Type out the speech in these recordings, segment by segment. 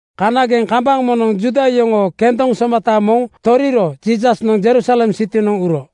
Kanageŋ kambaŋ moŋnoŋ Juuda yoŋoo kendoŋ somata moŋ toriro Jiisasnoŋ Jerusalem sitinoŋ uro.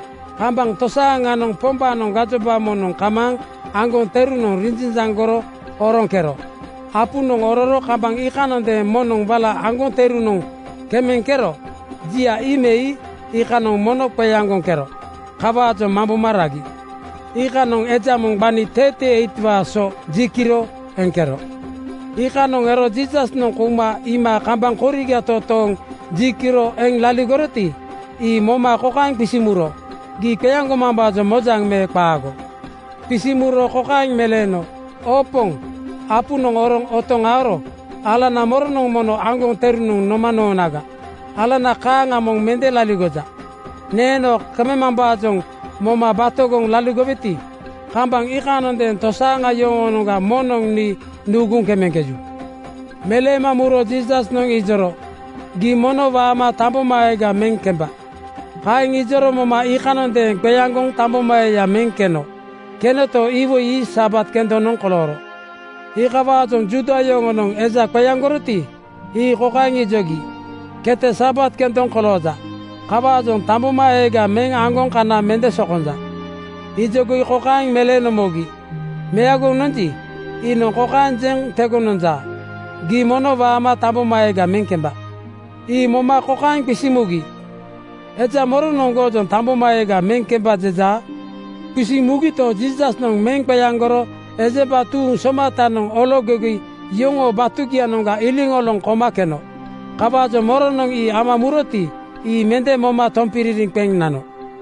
Kambaŋ tosaaŋanoŋ Pombaanoŋ gajoba moŋnoŋ kamaaŋ aŋgoŋ terunoŋ rinjanjaŋgoro oroŋkero. Apunoŋ ororo kambaŋ iikanondeeŋ moŋnoŋ wala aŋgoŋ terunoŋ kemeŋkero jia ii me ii iikanoŋ mono qeaŋgoŋkero. Kawaajoŋ mamboma ragi. Iikanoŋ eja moŋ gbani 38:waa so ji kiro eŋkero. Iikanoŋ ero Jiisasnoŋ kouma iima kambaŋ koriga totooŋ ji kiro eŋ laligoroti, ii moma kokaeŋ qisiŋ muro, “Gii qeaŋgomambaajoŋ mojaŋ me qaago?” Qisiŋ muro kokaeŋ meleeno, “Oo Poŋ, apunoŋ oroŋ otoŋ aoro alana moronoŋ mono aŋgoŋ terunoŋ noma noonaga? Alana kaaŋa moŋ mende laligoja. Neeno kemambaajoŋ moma batogoŋ laligoweti, kambaŋ iikanondeeŋ tosaaŋa yoŋoonoŋga moŋnoŋ nii nuuguŋ kemeŋkeju.” Meleema muro Jiisasnoŋ ijoro, “Gii mono waama tambomaeega meŋ kemba.” Kaeŋ ijoro moma iikanondeeŋ qeaŋgoŋ tambomaeeya meŋ keno. Kenoto, iwoi ii Sabat kendonoŋ kolooro. Iikawaajoŋ Juuda yoŋonoŋ eja qeaŋgoroti, ii kokaeŋ ijogi, “Kete Sabat kendoŋ kolooja. Kawaajoŋ tambomaeega meŋ aŋgoŋ kana mende sokonja.” Ijogi kokaeŋ meleeno mogi, “Meagoŋ nonji, iinoŋ kokaeŋ jeŋ tegoŋ nonja, ‘Gii mono waama tambomaeega meŋ kemba’.” Ii moma kokaeŋ qisiŋ mugi, “Eja moronoŋ goojoŋ ‘Tambomaeega meŋ kemba,’ jejaa?” Qisiŋ mugito, Jiisasnoŋ meŋ qeaŋgoro ejemba tuuŋ somatanoŋ ologogi yoŋoo batugianoŋga iliŋoloŋ koma keno. Kawaajoŋ moronoŋ ii ama muroti, ii mende moma tompiririŋ qeŋ nano.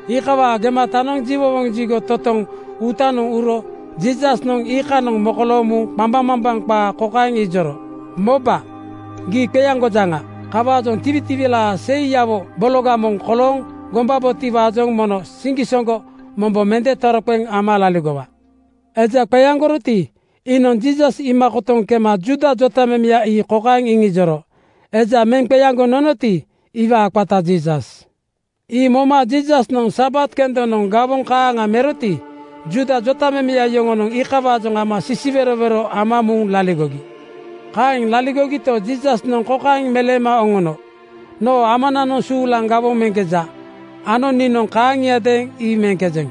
Iikawaa gematanoŋ jiwowoŋ jigo totoŋ uutanoŋ uro Jiisasnoŋ iikanoŋ mokolooŋ muŋ qambaŋmambaŋ qaa kokaeŋ ijoro, “Moba, gii qeaŋgojaŋa. Kawaajoŋ tiwitiwilaa seiyawo bologa moŋ kolooŋ gombabotiwaajoŋ mono siŋgisoŋgo mombo mende toroqeŋ ama laligowa.” Eja qeaŋgoroti, iinoŋ Jiisas iima kotoŋ kema Juuda jotamemeya ii kokaeŋ iŋijoro, “Eja meŋ qeaŋgoŋ nonoti, iwaa qata Jiisas.” Ii moma Jiisasnoŋ Sabat kendonoŋ gawoŋ kaaŋa meroti, Juuda jotamemeya yoŋonoŋ iikawaajoŋ ama sisiwerowero ama muŋ laligogi. Kaeŋ laligogito, Jiisasnoŋ kokaeŋ meleema oŋono, “Noo Amananoŋ suulaŋ gawoŋ meŋkeja ano niinoŋ kaaŋiadeeŋ ii meŋkejeŋ.”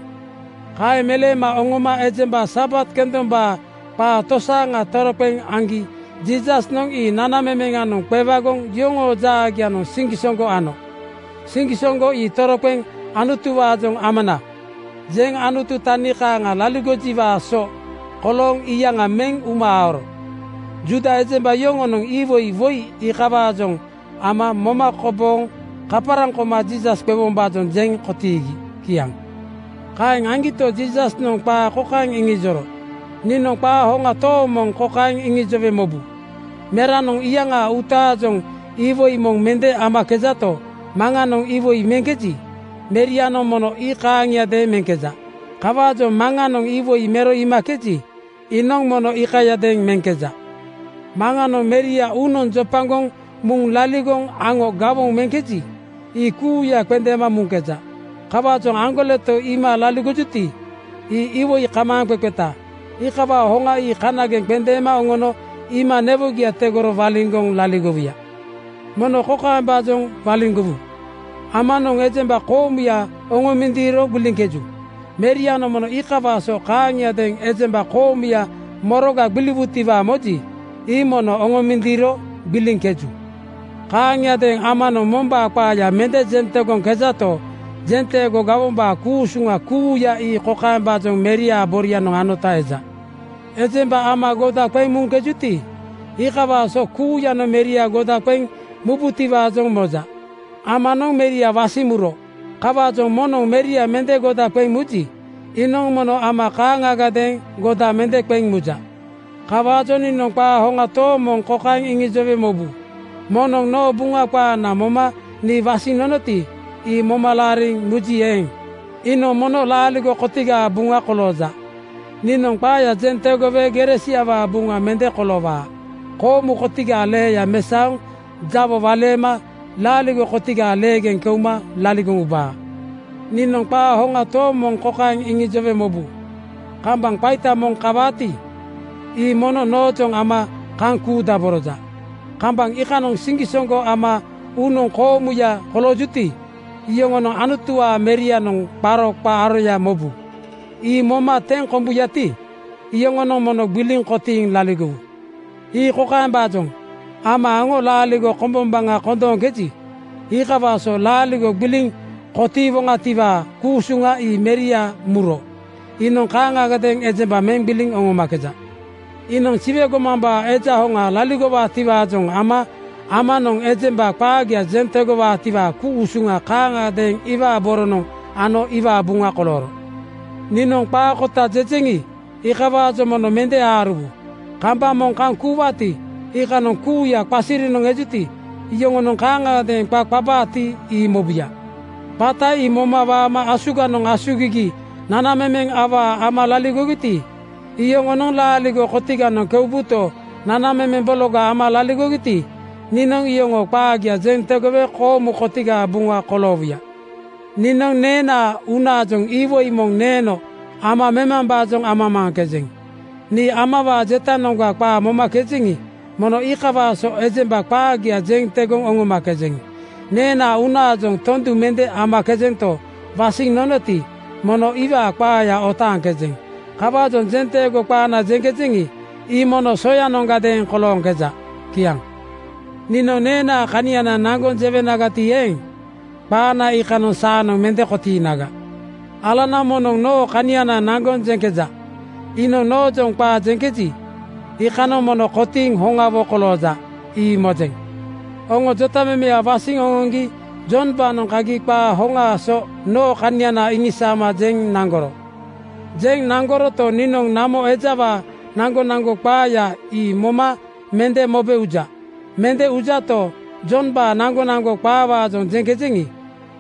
Kaeŋ meleema oŋoma ejemba Sabat kendombaa qaa tosaaŋa toroqeŋ aŋgi Jiisasnoŋ ii nanamemeŋanoŋ qewagoŋ yoŋoo jaagianoŋ siŋgisoŋgo ano. Siŋgisoŋgo ii toroqeŋ Anutuwaajoŋ ‘Amana!’ jeŋ Anutu tani kaaŋa laligojiwaa so kolooŋ iyaŋa meŋ uma aoro. Juuda ejemba yoŋonoŋ iwoi woi iikawaajoŋ ama moma kobooŋ kaparaŋ koma Jiisas qewombaajoŋ jeŋ kotiigi. Kiaŋ. Kaeŋ aŋgito, Jiisasnoŋ qaa kokaeŋ iŋijoro, “Niinoŋ qaa hoŋa tooŋ moŋ kokaeŋ iŋijowe mobu: Meranoŋ iyaŋaa uutaajoŋ iwoi moŋ mende meŋkejato, Maŋanoŋ iwoi meŋkeji, Merianoŋ mono ii kaaŋiadeeŋ meŋkeja. Kawaajoŋ Maŋanoŋ iwoi mero iimakeji, iinoŋ mono iikayadeeŋ meŋkeja. Maŋanoŋ Meria uunoŋ jopagoŋ muŋ laligoŋ aŋo gawoŋ meŋkeji, ii kuuya qendeema muŋkeja. Kawaajoŋ aŋgoleto iima laligojuti, ii iwoi kamaaŋqeqeta. Iikawaa hoŋa ii kanageŋ qendeema oŋono iima newogia tegoro waliŋgoŋ laligowuya. “Moŋ kokaembaajoŋ waliŋgowu: Amanoŋ ejemba koomuya oŋomindiiro gbiliŋkeju. Merianoŋ mono iikawaa so kaaŋiadeeŋ ejemba koomuya moroga gbiliwutiwaa moji, ii mono oŋomindiiro gbiliŋkeju. Kaaŋiadeeŋ Amanoŋ mombaa qaaya mende jeŋ tegoŋkejato, jenteego gawombaa ku-usuŋa kuuya ii kokaembaajoŋ Meriaa borianoŋ anota eja: “Ejemba Ama goda qeŋ muŋkejuti, iikawaa so kuuyanoŋ Meria goda qeŋ mubutiwaajoŋ moja. Amanoŋ Meria wasiŋ muro. Kawaajoŋ moŋnoŋ Meria mende goda qeŋ muji, iinoŋ mono Ama kaaŋagadeeŋ goda mende qeŋ muja. Kawaajoŋ niinoŋ qaa hoŋa tooŋ moŋ kokaeŋ iŋijowe mobu: Moŋnoŋ noo Buŋa qaana moma nii wasiŋ nonoti, ii moma laariŋ muji eeŋ, iinoŋ mono laaligo kotigaa buŋa kolooja. Niinoŋ qaaya jeŋ tegowe gere siawaa buŋa mende koloowaa. Koomu kotigaa leeya mesaoŋ jawo waleema laaligo kotigaa leegeŋ keuma laligoŋ ubaa. “Niinoŋ qaa hoŋa tooŋ moŋ kokaeŋ iŋijowe mobu: Kambaŋ qaita moŋ kawaati, ii mono noojoŋ ama kaŋ kuudaboroja. Kambaŋ iikanoŋ siŋgisoŋgo ama uunoŋ koomuya koloojuti, iyoŋonoŋ Anutuwaa Merianoŋ qaro qaa aroya mobu. Ii moma teŋ kombuyati, iyoŋonoŋ mono gbiliŋ kotiiŋ laligowu. Ii kokaembaajoŋ: Ama aŋo laaligo kombombaŋa kondooŋkeji, iikawaa so laaligo gbiliŋ kotiiwaatiwaa ku-usuŋa ii Meria muro iinoŋ kaaŋagadeeŋ ejemba meŋ gbiliŋ oŋomakeja. Iinoŋ Siwe gomambaa Eja Hoŋa laligojiwaajoŋ ama Amanoŋ ejemba qaagia jeŋ tegowaatiwaa ku-usuŋa kaaŋagadeeŋ iwaa boronoŋ ano iwaa buŋa kolooro. “Niinoŋ qaa kota jejeŋi, iikawaajoŋ mono mende aaruwu. Kambaŋ moŋ kaŋ kuuwaati, iikanoŋ kuuya qasirinoŋ ejuti, yoŋonoŋ kaaŋagadeeŋ qa qabaati, ii mobuya. Qata ii moma waama asuganoŋ asugigi nanamemeŋ awaa ama laligogiti, iyoŋonoŋ laaligo kotiganoŋ keubuto, nanamemeŋ bologa ama laligogiti, niinoŋ iyoŋoo qaagia jeŋ tegowe koomu kotigaa buŋa koloowuya. Niinoŋ neenaa uunaajoŋ iwoi moŋ neeno ama memambaajoŋ amamaaŋkejeŋ. Nii Amawaa jetanoŋga qaa momakejeŋi, mono iikawaa so ejemba qaagia jeŋ tegoŋ oŋomakejeŋ. Neenaa uunaajoŋ tondu mende meŋkejento, wasiŋ nonoti, mono iwaa qaaya otaaŋkejeŋ. Kawaajoŋ jenteego qaana jeŋkejeŋi, ii mono soyanoŋgadeeŋ kolooŋkeja.” Kiaŋ. “Niinoŋ neenaa kaniana naŋgoŋ jewenagati eeŋ, qaana iikanoŋ saanoŋ mende kotiinaga. Alana moŋnoŋ noo kaniana naŋgoŋ jeŋkeja. Iinoŋ noojoŋ qaa jeŋkeji, iikanoŋ mono kotiiŋ hoŋawo kolooja, ii mojeŋ. Oŋo jotamemeya wasiŋ oŋoŋgi Jombaanoŋ kagi qaa hoŋaa so noo kaniana iŋisaama jeŋ naŋgoro. “Jeŋ naŋgoroto, niinoŋ namo ejawaa naŋgonaŋgo qaaya ii moma mende mobe uja. Mende ujato, Jombaa naŋgonaŋgo qaawaajoŋ jeŋkejeŋi,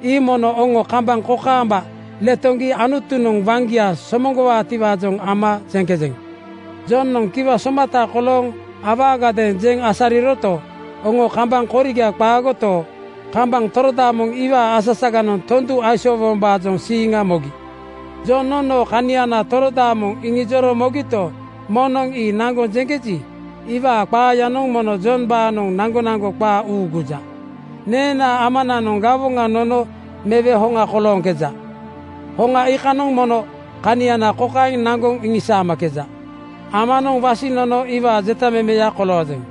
ii mono oŋo kambaŋ kokaamba letoŋgi Anutunoŋ waŋgia somoŋgowaatiwaajoŋ ama jeŋkejeŋ. Jonoŋ kiwa somata kolooŋ awaagadeeŋ jeŋ asariroto, oŋo kambaŋ koriga qaagoto, kambaŋ torodaamoŋ iwaa asasaganoŋ tondu aisoowombaajoŋ siiŋa mogi. “Jonoŋ noo kaniana torodaamoŋ iŋijoro mogito, moŋnoŋ ii naŋgoŋ jeŋkeji, iwaa qaayanoŋ mono Jombaanoŋ naŋgonaŋgo qaa uuguja. Neenaa Amananoŋ gawoŋa nono mewe hoŋa kolooŋkeja. Hoŋa iikanoŋ mono kaniana kokaeŋ naŋgoŋ iŋisaamakeja: Amanoŋ wasiŋ nono iwaa jeta memeya koloojeŋ.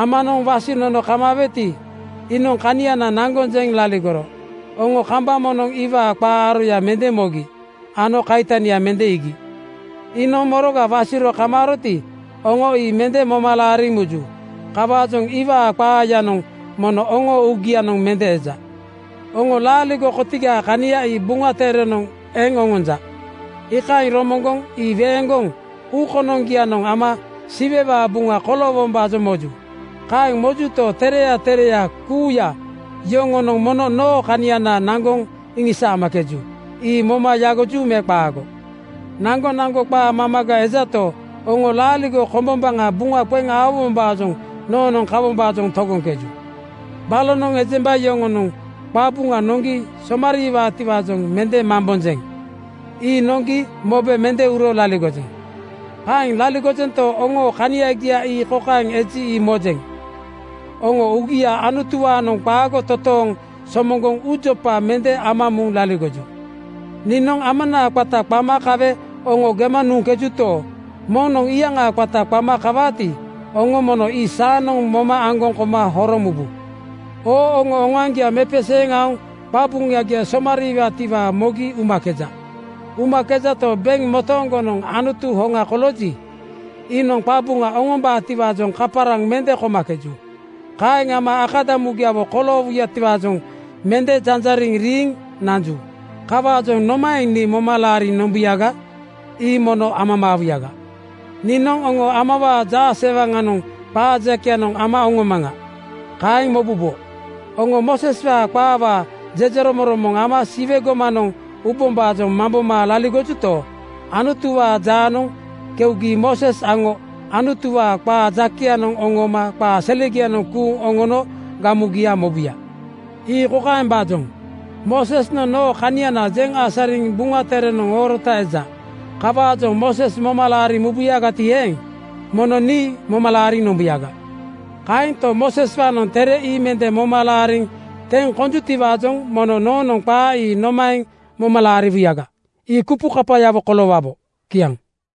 Amanoŋ wasiŋ nono kamaaweti, iinoŋ kaniana naŋgoŋ jeŋ laligoro. Oŋo kambaŋ moŋnoŋ iwaa qaa aroya mende mogi ano kaitania mende iigi. Iinoŋ moroga wasiro kamaaroti, oŋo ii mende moma laariŋ muju. Kawaajoŋ iwaa qaayanoŋ mono oŋoo uugianoŋ mende eja. “Oŋo laaligo kotigaa kania ii Buŋa Terenoŋ eŋ oŋonja, iikaeŋ romoŋgoŋ ii weeŋgoŋ uu konoŋgianoŋ ama Siwewaa buŋa koloowombaajoŋ moju. Kaeŋ mojuto, tereya tereya kuuya yoŋonoŋ mono noo kaniana naŋgoŋ iŋisaamakeju. Ii moma yagoju me qaago? Naŋgonaŋgo qaa mamaga ejato, oŋo laaligo kombombaŋa buŋa qeŋ aowombaajoŋ noonoŋ kawombaajoŋ togoŋkeju. Balonoŋ ejemba yoŋonoŋ qabuŋa noŋgi somariiwaatiwaajoŋ mende mambonjeŋ. Ii noŋgi mobe mende uro laligojeŋ. Kaeŋ laligojento, oŋoo kaniagia ii kokaeŋ eji, ii mojeŋ: Oŋo uugia Anutuwaanoŋ qaago totooŋ somoŋgoŋ uujopa mende ama muŋ laligoju. Niinoŋ Amanaa qata qama kawe oŋo gema nuŋkejuto, moŋnoŋ iyaŋaa qata qama kawaati, oŋo mono ii saanoŋ moma aŋgoŋ koma horoŋ mubu. “Oo oŋo oŋoaŋgia mepeseeŋ aoŋ qabuŋagia somariiwaatiwaa mogi umakeja. Umakejato, beŋ motooŋgonoŋ Anutu hoŋa kolooji, iinoŋ qabuŋa oŋombaatiwaajoŋ kaparaŋ mende komakeju. Kaeŋ ama akadamugiawo koloowutiwaajoŋ mende janjariŋ riiŋ nanju. Kawaajoŋ nomaeŋ nii moma laariŋ nombuyaga? Ii mono amamaawuyaga. “Niinoŋ oŋo ‘Amawaa jaasewaŋanoŋ qaa jakeyanoŋ ama oŋomaŋa,’ kaeŋ mobubo. Oŋo Mooseswaa qaawaa jejeromoŋromoŋ ama Siwe gomanoŋ ubombaajoŋ mamboma laligojuto, Anutuwaa jaanoŋ keugi Mooses aŋo Anutuwaa qaa jakeyanoŋ oŋooma qaa selegianoŋ kuuŋ oŋono gamugia mobuya. “Ii kokaembaajoŋ: Moosesnoŋ noo kaniana jeŋ asariŋ Buŋa Terenoŋ oorota eja. Kawaajoŋ Mooses moma laariŋ mubuyagati eeŋ, mono nii moma laariŋ nombuyaga. Kaanto, Mooseswaanoŋ tere ii mende moma laariŋ teŋ konjutiwaajoŋ mono noonoŋ qaa ii nomaeŋ moma laariwuyaga? Ii kupukapayawo koloowabo.” Kiaŋ.